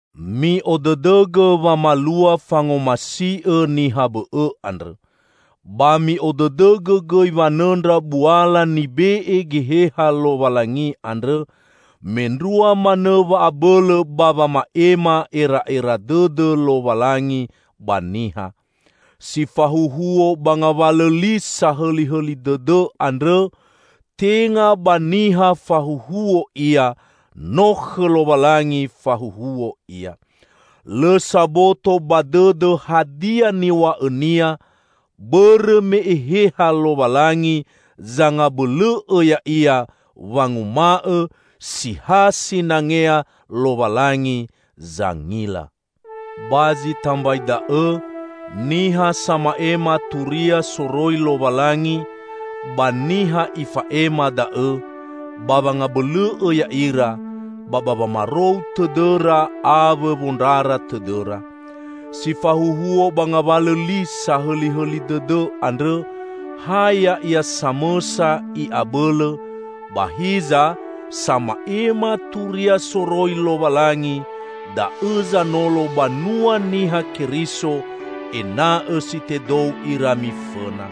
Mi'odõdõgõ wamalua fangomasi'õ niha bõ'õ andrõ. Ba mi'odõdõgõ gõi wanõndra buala nibe'e Geheha Lowalangi andrõ, mendrua manõ wa'abõlõ ba wama'ema era'era dõdõ Lowalangi ba niha. Si fahuhuo ba ngawalõ li sahõlihõli dõdõ andrõ, tenga ba niha fahuhuo ia; no khõ Lowalangi fahuhuo ia. Lõ saboto ba dõdõ hadia niw̃a'õnia, bõrõ me Eheha Lowalangi zangabõlõ'õ ya'ia wanguma'õ si ha sinangea Lowalangi zangila. Ba zi tambai da'õ, niha sama'ema turia soroi Lowalangi, ba niha ifa'ema da'õ; ba wangabõlõ'õ ya'ira, ba ba wamarou tõdõra awõ wondrara tõdõra. Si fahuhuo ba ngawalõ li sahõlihõli dõdõ andrõ, ha ya'ia samõsa i'abõlõ, ba hiza, sama'ema turia soroi Lowalangi, da'õ zanolo banua Niha Keriso ena'õ si tedou ira mifõna.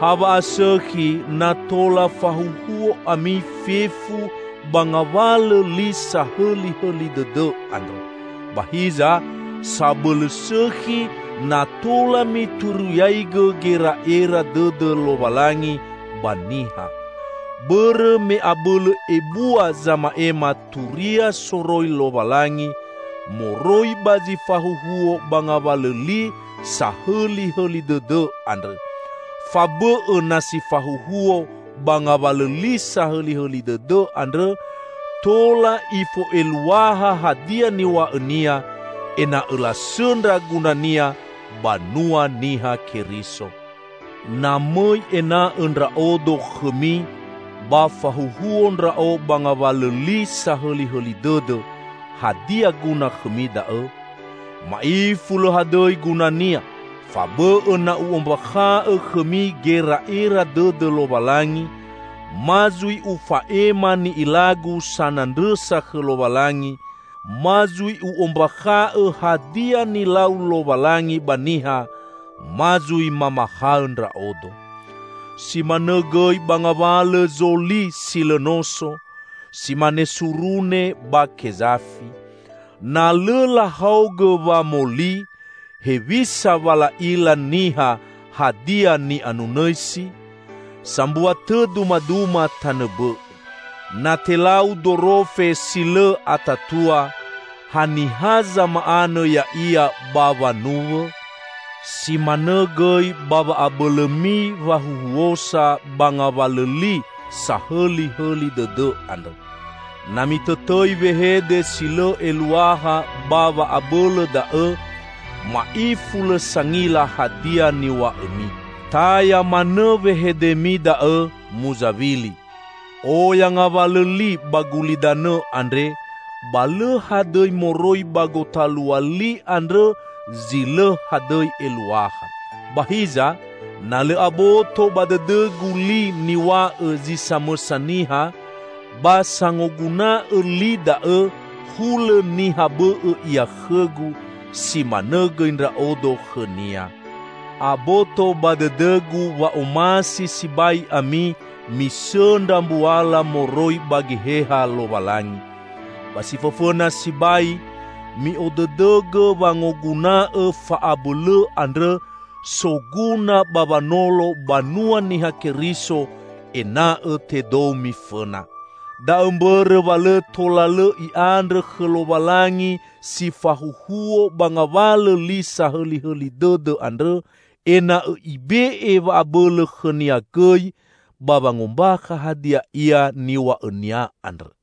Ha wa'asõkhi na tola fahuhuo ami fefu ba ngawalõ li sahõlihõli dõdõ andrõ. Ba hiza, sabõlõ sõkhi na tola mituriaigõ gera'era dõdõ Lowalangi ba niha. Bõrõ me abõlõ ebua zama'ema turia soroi Lowalangi, moroi ba zi fahuhuo ba ngawalõ li sahõlihõli dõdõ andrõ; fabõ'õ na si fahuhuo ba ngawalõ li sahõlihõli dõdõ andrõ tola ifo'eluaha hadia niw̃a'õnia, ena'õ lasõndra gunania banua Niha Keriso. Na mõi ena'õ ndra'odo khõmi ba fahuhuo ndra'o ba ngawalõ li sahõlihõli dõdõ, hadia guna khõmi da'õ? Ma'ifu lõ hadõi gunania! Fabõ'õ na u'ombakha'õ khõmi gera'era dõdõ Lowalangi, ma zui ufa'ema ni'ilagu sanandrõsa khõ Lowalangi, ma zui u'ombakha'õ hadia nilau Lowalangi ba niha, ma zui mamahaõ ndra'odo. Si manõ gõi ba ngawalõ zo li si lõ noso, si mane surune, ba kezafi. Na lõ lahaogõ wamoli, hewisa wa la'ila niha hadia ni'anunõisi? Sambua tõ dumaduma tanõ bõ'õ: Na telau dorofe si lõ atatua, haniha zama'anõ ya'ia ba wanuwõ? Si manõ gõi ba wa'abõlõmi wahuhuosa ba ngawalõ li sahõlihõli dõdõ andrõ. Na mitõtõi wehede si lõ eluaha ba wa'abõlõ da'õ, ma'ifu lõ sangila hadia niw̃a'õmi. Taya manõ wehedemi da'õ muzawili. Oya ngawalõ li ba gulidanõ andre, ba lõ hadõi moroi ba gotalua li andrõ zi lõ hadõi eluaha. Ba hiza, na lõ aboto ba dõdõgu li niw̃a'õ zi samõsa niha, ba sangoguna'õ li da'õ hulõ niha bõ'õ ia khõgu; si manõ gõi ndra'odo khõnia. Aboto ba dõdõgu wa omasi sibai ami misõndra mbuala moroi ba Geheha Lowalangi. Ba si fõfõna sibai, mi'odõdõgõ wangoguna'õ fa'abõlõ andrõ, soguna ba wanolo banua Niha Keriso ena'õ tedou mifõna. Da'õ mbõrõ wa lõ tola lõ i'andrõ khõ Lowalangi si fahuhuo ba ngawalõ li sahõlihõli dõdõ andrõ ena'õ Ibe'e wa'abõlõ khõnia gõi ba wangombakha hadia ia niw̃a'õnia andrõ.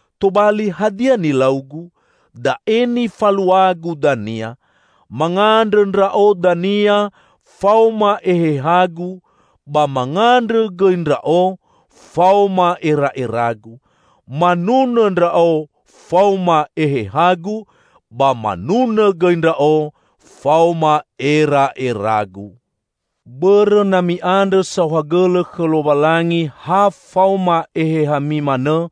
Tobali, hadia nilaugu? Da'e nifaluagu dania: Mangandrõ ndra'o dania faoma ehehagu ba mangandrõ gõi ndra'o faoma era'eragu. Manunõ ndra'o faoma ehehagu, ba manunõ gõi ndra'o faoma era'eragu. Bõrõ na mi'andrõ saohagõlõ khõ Lowalangi ha faoma ehehami manõ,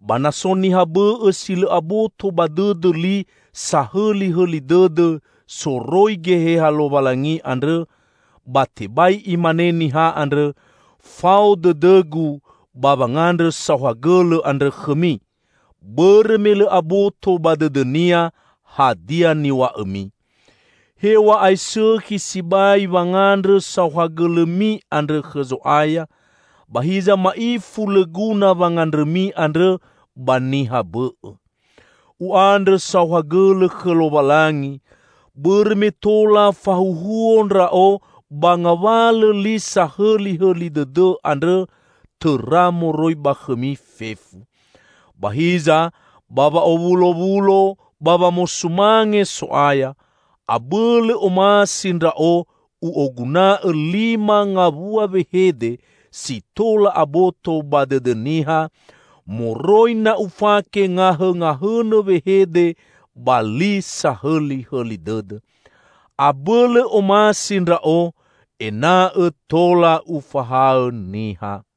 ba na so niha bõ'õ si lõ aboto ba dõdõ li sahõlihõli dõdõ soroi Geheha Lowalangi andrõ, ba tebai imane niha andrõ, "Fao dõdõgu" ba wangandrõ saohagõlõ andrõ khõmi; bõrõ me lõ aboto ba dõdõnia hadia niw̃a'õmi. Hew̃a'ae sõkhi sibai wangandrõ saohagõlõmi andrõ khõ Zo'aya, ba hiza ma'ifu lõ guna wangandrõmi andrõ ba niha bõ'õ. U'andrõ saohagõlõ khõ Lowalangi bõrõ me tola fahuhuo ndra'o ba ngawalõ li sahõlihõli dõdõ andrõ tõra moroi ba khõmi fefu. Ba hiza, ba wa'owulowulo ba wamosumange So'aya, abõlõ omasi ndra'o u'oguna'õ lima ngawua wehede si tola aboto ba dõdõ niha, moroi na ufake ngahõngahõnõ wehede ba li sahõlihõli dõdõ. Abõlõ omasi ndra'o ena'õ tola ufahaõ niha.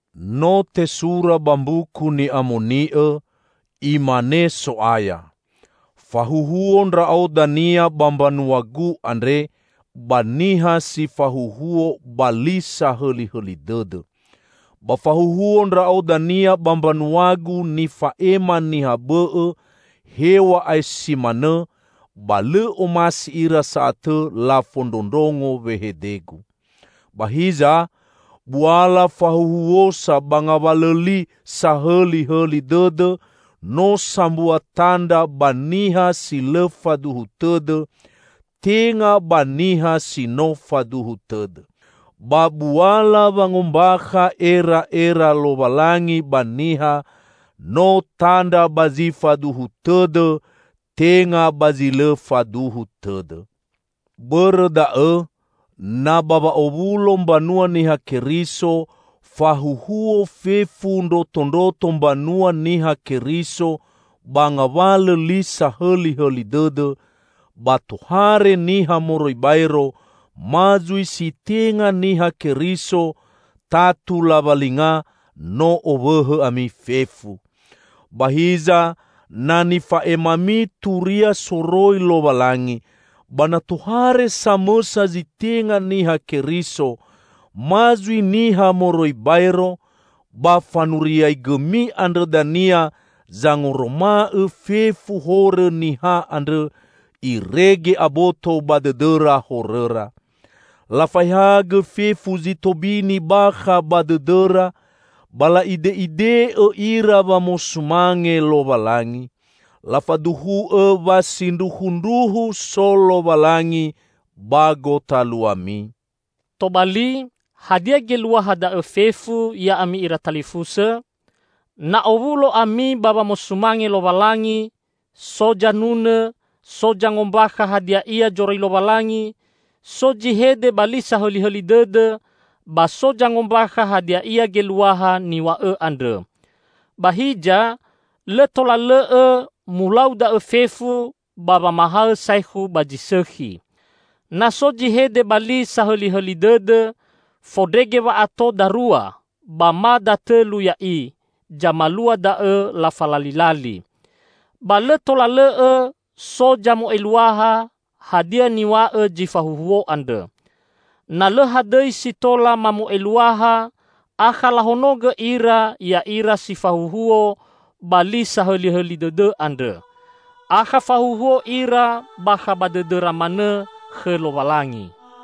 No tesura ba Mbuku Ni'amoni'õ, "Imane So'aya, 'Fahuhuo Ndra'o dania ba mbanua-Gu andre, ba niha si fahuhuo ba li sahõlihõli dõdõ. Ba fahuhuo Ndra'o dania ba mbanua-Gu nifa'ema niha bõ'õ; hew̃a'ae si manõ, ba lõ omasi ira sa'atõ lafondrondrongo wehede-Gu.'" Ba hiza, buala fahuhuosa ba ngawalõ li sahõlihõli dõdõ no sambua tandra ba niha si lõ faduhu tõdõ, tenga ba niha si no faduhu tõdõ. Ba buala wangombakha era'era Lowalangi ba niha, no tandra ba zi faduhu tõdõ, tenga ba zi lõ faduhu tõdõ. Bõrõ da'õ, na ba wa'owulo mbanua Niha Keriso, fahuhuo fefu ndrotondroto mbanua Niha Keriso ba ngawalõ li sahõlihõli dõdõ, ba tohare niha moroi baero, ma zui si tenga Niha Keriso, tatu lawalinga no owõhõ ami fefu! Ba hiza na nifa'emami turia soroi Lowalangi, ba na tohare samõsa zi tenga Niha Keriso ma zui niha moroi baero, ba fanuriagõmi andrõ dania zangoroma'õ fefu horõ niha andrõ, irege aboto ba dõdõra horõra. Lafaehagõ fefu zi tobini bakha ba dõdõra, ba la'ide'ide'õ ira wamosumange Lowalangi. Lafaduhu'õ wa sindruhundruhu so Lowalangi ba gotaluami. Tobali, hadia geluaha da'õ fefu, ya'ami ira talifusõ? Na owulo ami ba wamosumange Lowalangi: so zanunõ, so zangombakha hadia ia zoroi Lowalangi, so zi hede ba li sahõlihõli dõdõ, ba so zangombakha hadia ia geluaha niw̃a'õ andrõ. Ba hiza, lõ tola lõ'õ mulau da'õ fefu ba wamahaõ saekhu ba zi sõkhi. Na so zi hede ba li sahõlihõli dõdõ, fondrege wa'ato darua ba ma datõlu ya'i zamalua da'õ lafalalilali. Ba lõ tola lõ'õ so zamo'eluaha hadia niw̃a'õ zi fahuhuo andrõ. Na lõ hadõi si tola mamo'eluaha akha lahonogõ ira ya'ira si fahuhuo ba li sahõlihõli dõdõ andrõ. Akha fahuhuo ira bakha ba dõdõra manõ khõ Lowalangi.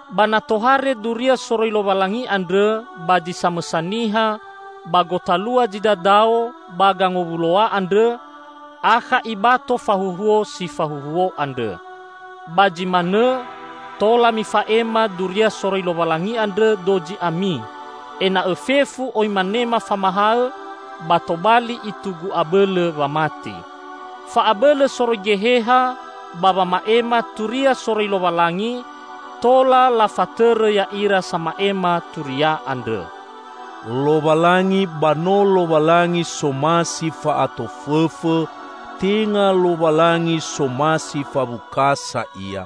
Ba na tohare duria soroi Lowalangi andrõ ba zi samõsa niha ba gotalua zi dadao ba gangowuloa andrõ, akha ibato fahuhuo si fahuhuo andrõ. Ba zi manõ, tola mifa'ema duria soroi Lowalangi andrõ, dozi ami: ena'õ fefu oi manema famahaõ ba tobali itugu abõlõ wamati. Fa'abõlõ soroi Geheha ba wama'ema turia soroi Lowalangi tola lafatõrõ ya'ira sama'ema turia andrõ. Lowalangi ba no Lowalangi somasi fa'atofõfõ; tenga Lowalangi somasi fawukasa Ia.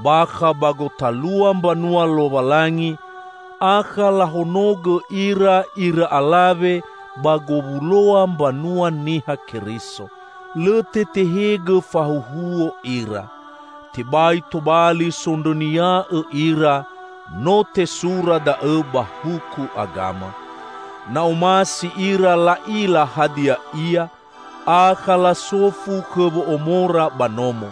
Bakha ba gotalua mbanua Lowalangi, akha lahonogõ ira ira alawe ba gowuloa mbanua Niha Keriso. Lõ tetehegõ fahuhuo ira. Tebai tobali sondrõnia'õ ira; no tesura da'õ ba huku agama. Na omasi ira la'ila hadia ia, akha lasofu khõ wo'omora ba nomo.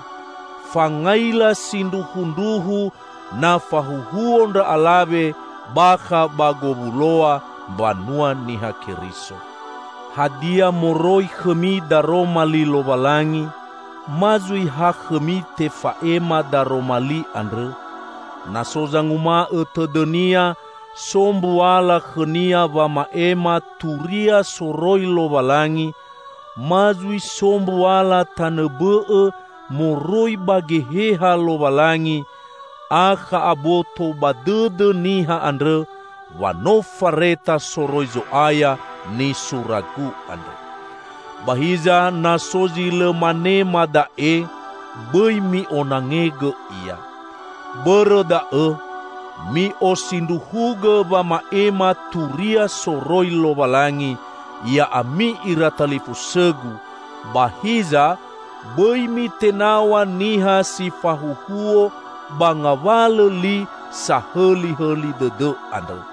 Fangaila sindruhundruhu na fahuhuo ndra alawe bakha ba gowuloa mbanua Niha Keriso. Hadia moroi khõmi daroma li Lowalangi? Ma zui ha khõmi tefa'ema daroma li andrõ? Na so zanguma'õ tõdõnia so mbuala khõnia wama'ema turia soroi Lowalangi, ma zui so mbuala tanõ bõ'õ moroi ba Geheha Lowalangi, akha aboto ba dõdõ niha andrõ wa no fareta soroi Zo'aya nisuragu andre. Ba hiza na so zi lõ manema da'e, bõi mi'onangegõ ia. Bõrõ da'õ, mi'osindruhugõ wama'ema turia soroi Lowalangi, ya'ami ira talifusõgu, ba hiza, bõi mitenaw̃a niha si fahuhuo ba ngawalõ li sahõlihõli dõdõ andrõ.